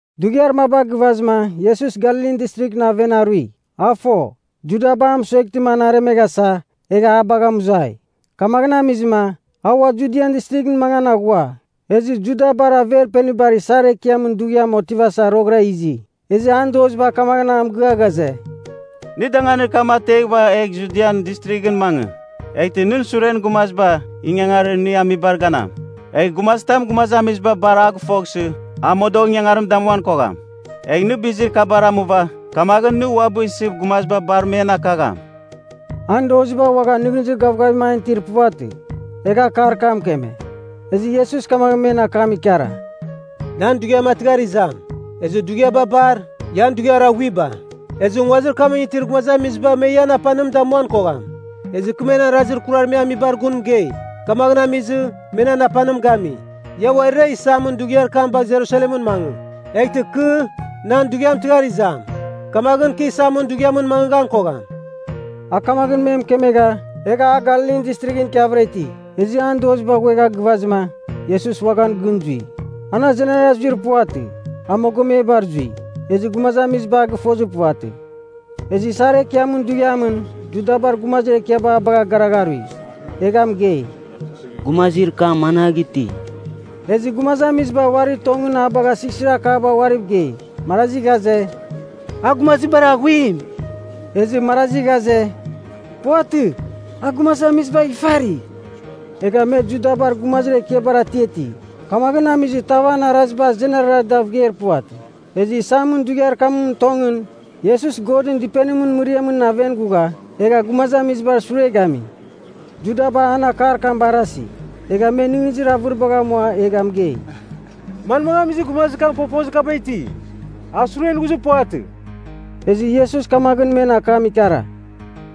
Dughiar maba gɨvazɨma, Iesus Galilin Distrighɨn aven arui. A fo, Judaba a mɨsueghtɨma an aremeghasa egha a bagha mɨzuai. Kamaghɨn amizɨma, a ua Judian Distrighɨn mangan aghua. Ezɨ Judabar Averpenibar Isar Ekiamɨn Dughiam otivasa roghɨra izi. Ezɨ an doziba kamaghɨn a mɨgɨa ghaze, “Nɨ danganir kam ateghɨva egh Judian Distrighɨn mangɨ. Eghtɨ nɨn suren gumaziba ingangarir nɨ amibar ganam. Egh gumazitam gumazamiziba bar a gɨfoghsɨ, a modogh ingangarim damuan kogham. Egh nɨ bizir kabar amuava, kamaghɨn nɨ uabɨ isɨ gumaziba bar men akagham.” (An doziba uaghan nɨghnɨzir gavgavim an itir puvatɨ, egha akar kam mɨkeme.) Ezɨ Iesus kamaghɨn men akam ikara, “Nan dughiam a tɨghar izam. Ezɨ dughiaba bar, ian dughiar aghuiba. Ezɨ nguazir kamɨn itir gumazamiziba me ian apanim damuan kogham. Ezɨ kɨ men arazir kurar me amibar gun mɨgei. Kamaghɨn amizɨ, me nan apanim gami. Ia uarira isamɨn dughiar kam bagh Jerusalemɨn mangɨ. Eghtɨ kɨ, nan dughiam tɨghar izam, kamaghɨn, kɨ isamɨn dughiamɨn mangɨghan kogham.” A kamaghɨn me mɨkemegha, egha a Galilin Distrighɨn ikiavɨra iti. Ezɨ an doziba ghuegha gɨvazɨma, Iesus uaghan gɨn zui. An azenara zuir puvatɨ, a mogomebar zui, ezɨ gumazamiziba a gɨfozir puvatɨ. Ezɨ isar ekiamɨn dughiamɨn, Judabar gumazir ekiaba a bagha garagharui, egha mɨgei, “Gumazir kam managh iti?” Ezɨ gumazamiziba uarir tongɨn a bagha sighsirakaba uariv gei. Marazi ghaze, “A gumazir bar aghuim.” Ezɨ marazi ghaze, “Puvatɨ, a gumazamizibagh ifari.” Egha me Judabar gumazir ekiabar atiati. Kamaghɨn amizɨ tav an araziba azenara dav geir puvatɨ. Ezɨ isamɨn dughiar kamɨn tongɨn, Iesus Godɨn dɨpenimɨn mɨriamɨn aven ghugha egha gumazamizibar sure gami. Judaba an akar kam barasi, egha me nɨghnɨzir avɨribagh amua egha mɨgei, “Manmagh amizɨ gumazir kam fofozir kaba iti? A suren ghuzir puvatɨ.” Ezɨ Iesus kamaghɨn men akam ikara,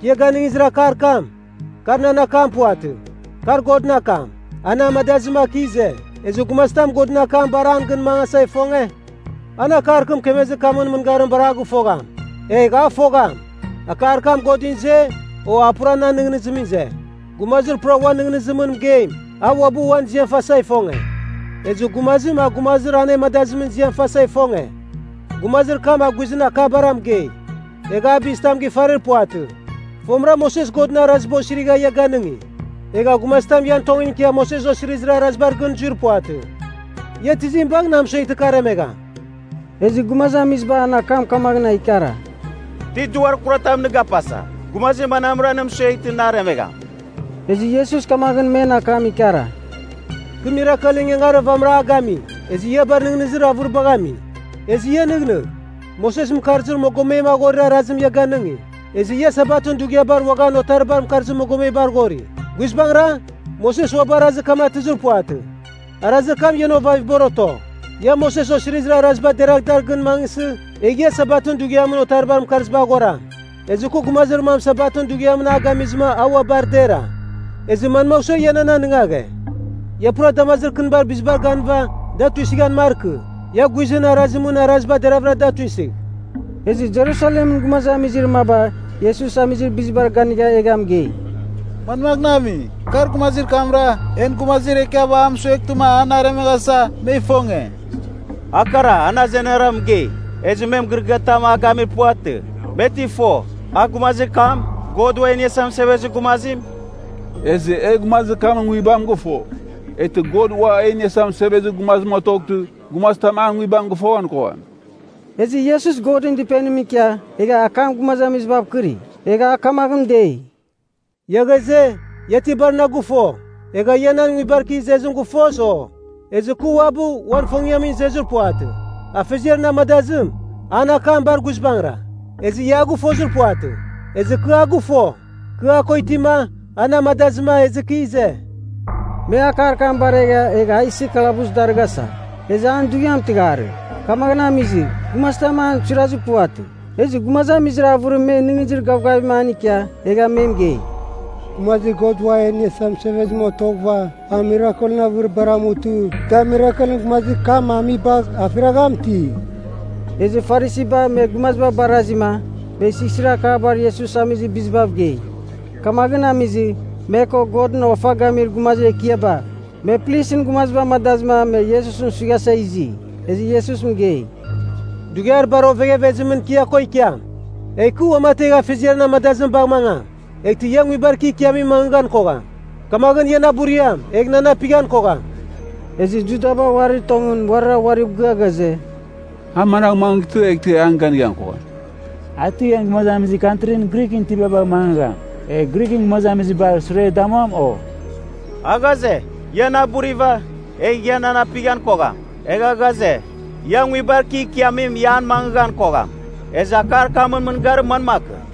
“Kɨ ia ganɨngizir akar kam, kar nan akam puvatɨ, kar Godɨn akam, a na amadazɨma kɨ ize. Ezɨ gumazitam Godɨn akam bar an gɨn mangasa ifonge, an akar kɨ mɨkemezir kamɨn mɨngarim bar a gɨfogham. Egh a fogham, akar kam Godɨn ize, o a pura nan nɨghnɨzimɨn ize. Gumazir pura uan nɨghnɨzimɨn mɨgeim, a uabɨ uan ziam fasa ifonge. Ezɨ gumazim a gumazir anemadazimɨn ziam fasa ifonge, gumazir kam a guizɨn akabara mɨgei, egha a bizitam gifarir puvatɨ. “Fomɨra Moses Godɨn Araziba osirigha ia ganɨngi. Egha gumazitam ian tongɨn ikia Moses Osirizir Arazibar gɨn zuir puvatɨ. Ia tizim bagh na mɨsueghtɨ kɨ aremegham?” Ezɨ gumazamiziba an akam kamaghɨn a ikara, “Ti duar kuratam nɨ gapasa! Gumazir manamra nɨ mɨsueghtɨ na aremegham?” Ezɨ Iesus kamaghɨn men akam ikara, “Kɨ mirakelɨn ingangarir vamɨra a gami, ezɨ ia bar nɨghnɨzir avɨribagh ami. Ezɨ ia nɨghnɨgh, Moses mɨkarzir mogomem aghorir arazim ia ganɨngi, ezɨ ia Sabatɨn dughiabar uaghan otaribar mɨkarzir mogomebar ghori. (Guizbangɨra, Moses uabɨ arazir kam atɨzir puvatɨ. Arazir kam ian ovavibar oto.) Ia Moses Osirizir Araziba deragh a dar gɨn mangɨsɨ, egh ia Sabatɨn dughiamɨn otaribar mɨkarzibar ghoram. Ezɨ kɨ gumazir mam Sabatɨn dughiamɨn a gamizɨma a ua bar dera, ezɨ manmagh sua ia nan anɨngaghe? Ia pura damazir kɨnibar bizibar ganɨva, da tuisɨghan markɨ. Ia guizɨn arazimɨn araziba deravɨra da tuisɨgh.” Ezɨ Jerusalemɨn gumazamizir maba Iesus amizir bizibar ganigha egha mɨgei, “Manmaghɨn ami? Kar gumazir kamra, en gumazir ekiaba a mɨsueghtɨma an aremeghasa, me ifonge. A kara, an azenara mɨgei, ezɨ me mɨgɨrɨgɨatam a gamir puvatɨ. Me ti fo, a gumazir kam, God Ua E Iniasa Mɨsevezir Gumazim? Ezɨ e gumazir kamɨn nguibam gɨfo. Eghtɨ God Ua E Iniasa Mɨsevezir Gumazim otoghtɨ, gumazitam an nguibam gɨfoghan kogham.” Ezɨ Iesus Godɨn Dɨpenimɨn ikia egha akam gumazamizibav kɨri. Egha a kamaghɨn dei, “Ia ghaze, ia ti bar na gɨfo, egha ia nan nguibar kɨ izezim gɨfos, o? Ezɨ, kɨ uabɨ uan ifongiamɨn izezir puvatɨ. Afeziar na amadazim, an akam bar guizbangɨra. Ezɨ ia a gɨfozir puvatɨ. Ezɨ kɨ a gɨfo. Kɨ a ko itima, a na amadazɨma ezɨ kɨ ize.” Me akar kam baregha egha a isɨ kalabus darɨghasa. Ezɨ an dughiam tɨghar, kamaghɨn amizɨ, gumazitam an suirazir puvatɨ. Ezɨ gumazamizir avɨrim me nɨghnɨzir gavgavim an ikia, egha me mɨgei, “Gumazir God Ua E Iniasa Mɨsevezim otoghɨva, a mirakelɨn avɨribar amutɨ da mirakelɨn gumazir kam amibagh afiragham ti?” Ezɨ Farisiba me gumaziba barazima me sighsirakaba Iesus amizir bizibav gei. Kamaghɨn amizɨ, me ko, Godɨn ofa gamir gumazir ekiaba, me plisɨn gumaziba amadazɨma me Iesusɨn suighasa izi. Ezɨ Iesus mɨgei, “Dughiar bar oveghevezimɨn kɨ ia ko ikiam, egh kɨ uamategh Afeziar na amadazim bagh mangam. Eghtɨ ia nguibar kɨ ikiamimɨn mangɨghan kogham. Kamaghɨn ia na buriam, egh nan apighan kogham.” Ezɨ Judaba uarir tongɨn uarira uariv mɨgɨa ghaze, “A managh mangɨtɨ eghtɨ e an ganighan kogham? A ti en gumazamizir kantri Grighɨn itiba bagh mangɨgham, egh Grighɨn gumazamizibar sure damuam, o? A ghaze, ‘Ia na buriva, egh ia nan apighan kogham.’ Egha ghaze, ‘Ia nguibar kɨ ikiamim ia an mangɨgham kogham.’ Ezɨ akar kamɨn mɨngarim manmakɨn?”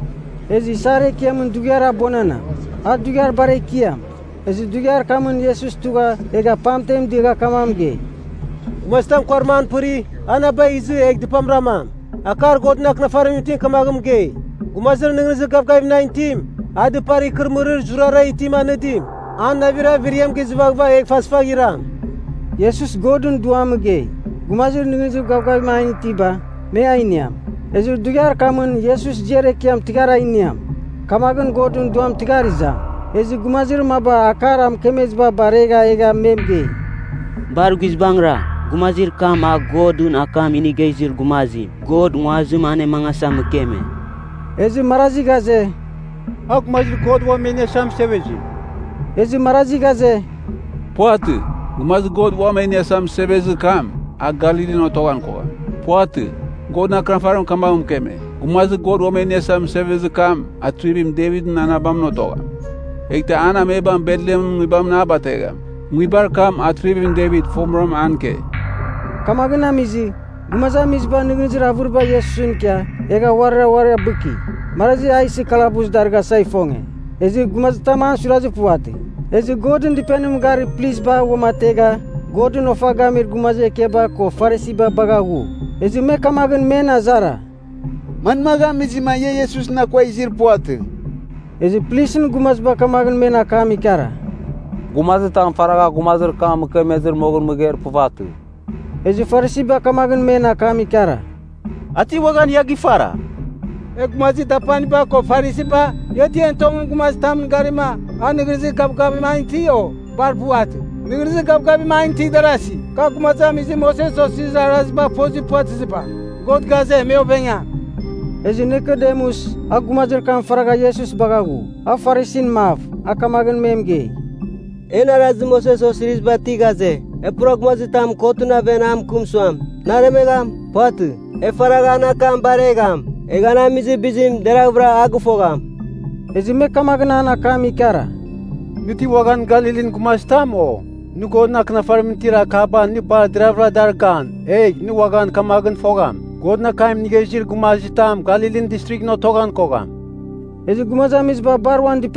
Ezɨ isar ekiamɨn dughiar abuananam, a dughiar bar ekiam. Ezɨ dughiar kamɨn Iesus tugha egha pamten diagha kamaghɨn mɨgei, “Gumazitam kuarim an pɨri, a na bagh izɨ egh dɨpam ramam. Akar Godɨn Akɨnafarimɨn itim kamaghɨn mɨgei, ‘Gumazir nɨghnɨzir gavgavim nan itim, a dɨpar ikɨrɨmɨrir zurara itim anɨdim, an navir averiam gizɨvaghɨva, egh fasfagh iram.’” Iesus Godɨn Duam mɨgei, gumazir nɨghnɨzir gavgavim an itiba, me a iniam. Ezɨ dughiar kamɨn Iesus ziar ekiam tɨghar a iniam, kamakɨn Godɨn Duam tɨghar izam. Ezɨ gumazir maba akar a mɨkemeziba baregha egha me mɨgei, “Bar guizbangɨra, gumazir kam a Godɨn akam inigha izir gumazim, God nguazim anemangasa mɨkeme.” Ezɨ marazi ghaze, “A Gumazir God Uam E Iniasa Mɨsevezim.” Ezɨ marazi ghaze, “Puvatɨ, Gumazir God Uam E Iniasa Mɨsevezir kam, a Galilin otoghan kogham. Puvatɨ. Godɨn Akɨnafarim kamaghɨn mɨkeme, Gumazir God Uam E Iniasa Mɨsevezir kam Atrivim Devitɨn anabamɨn otogham, eghtɨ an amebam Betlehemɨn nguibamɨn a bategham, nguibar kam Atrivim Devit fomɨra an ike.” Kamaghɨn amizɨ, gumazamiziba nɨghnɨzir avɨriba Iesusɨn ikia, egha uarira uari abɨki. Marazi a isɨ kalabus darɨghasa ifonge, ezɨ gumazitam an suirazir puvatɨ. Ezɨ Godɨn Dɨpenimɨn garir plisba uamategha Godɨn ofa gamir gumazir ekiaba ko Farisiba bagha ghu. Ezɨ me kamaghɨn me azara, “Manmagh amizɨma ia Iesusɨn akua izir puvatɨ?” Ezɨ plisɨn gumaziba kamaghɨn me akam ikara, “Gumazitam faragha gumazir kam mɨkemezɨ moghɨn mɨgeir puvatɨ.” Ezɨ Farisiba kamaghɨn men akam ikara, “A ti uaghan ia gifara? E gumazir dapaniba ko Farisiba, ia ti en tongɨn gumazitamɨn garima a nɨghnɨzir gavgavim an iti, o? Bar puvatɨ. Nɨghnɨzir gavgavim an itir darasi, ka gumazamizir Moses Osirizir Arazibagh fozir puvatɨziba. God ghaze, me ovengam.” Ezɨ Nikodemus, a gumazir kam faragha Iesus bagha ghu, a Farisin mav, a kamaghɨn me mɨgei, “En Arazir Moses Osiriziba ti ghaze, e pura gumazitam kotɨn aven a mɨkɨm suam, nɨ aremegham? Puvatɨ. E faragh an akam baregham, egh an amizir bizim deravɨra a gɨfogham.” Ezɨ me kamaghɨn an akam ikara, “Nɨ ti uaghan Galilin gumazitam, o? Nɨ Godɨn Akɨnafarimɨn itir akaba nɨ bar deravɨra dar gan, egh nɨ uaghan kamaghɨn fogham, Godɨn akam inigha izir gumazitam Galilin Distrighɨn otoghan kogham.” Ezɨ gumazamiziba bar uan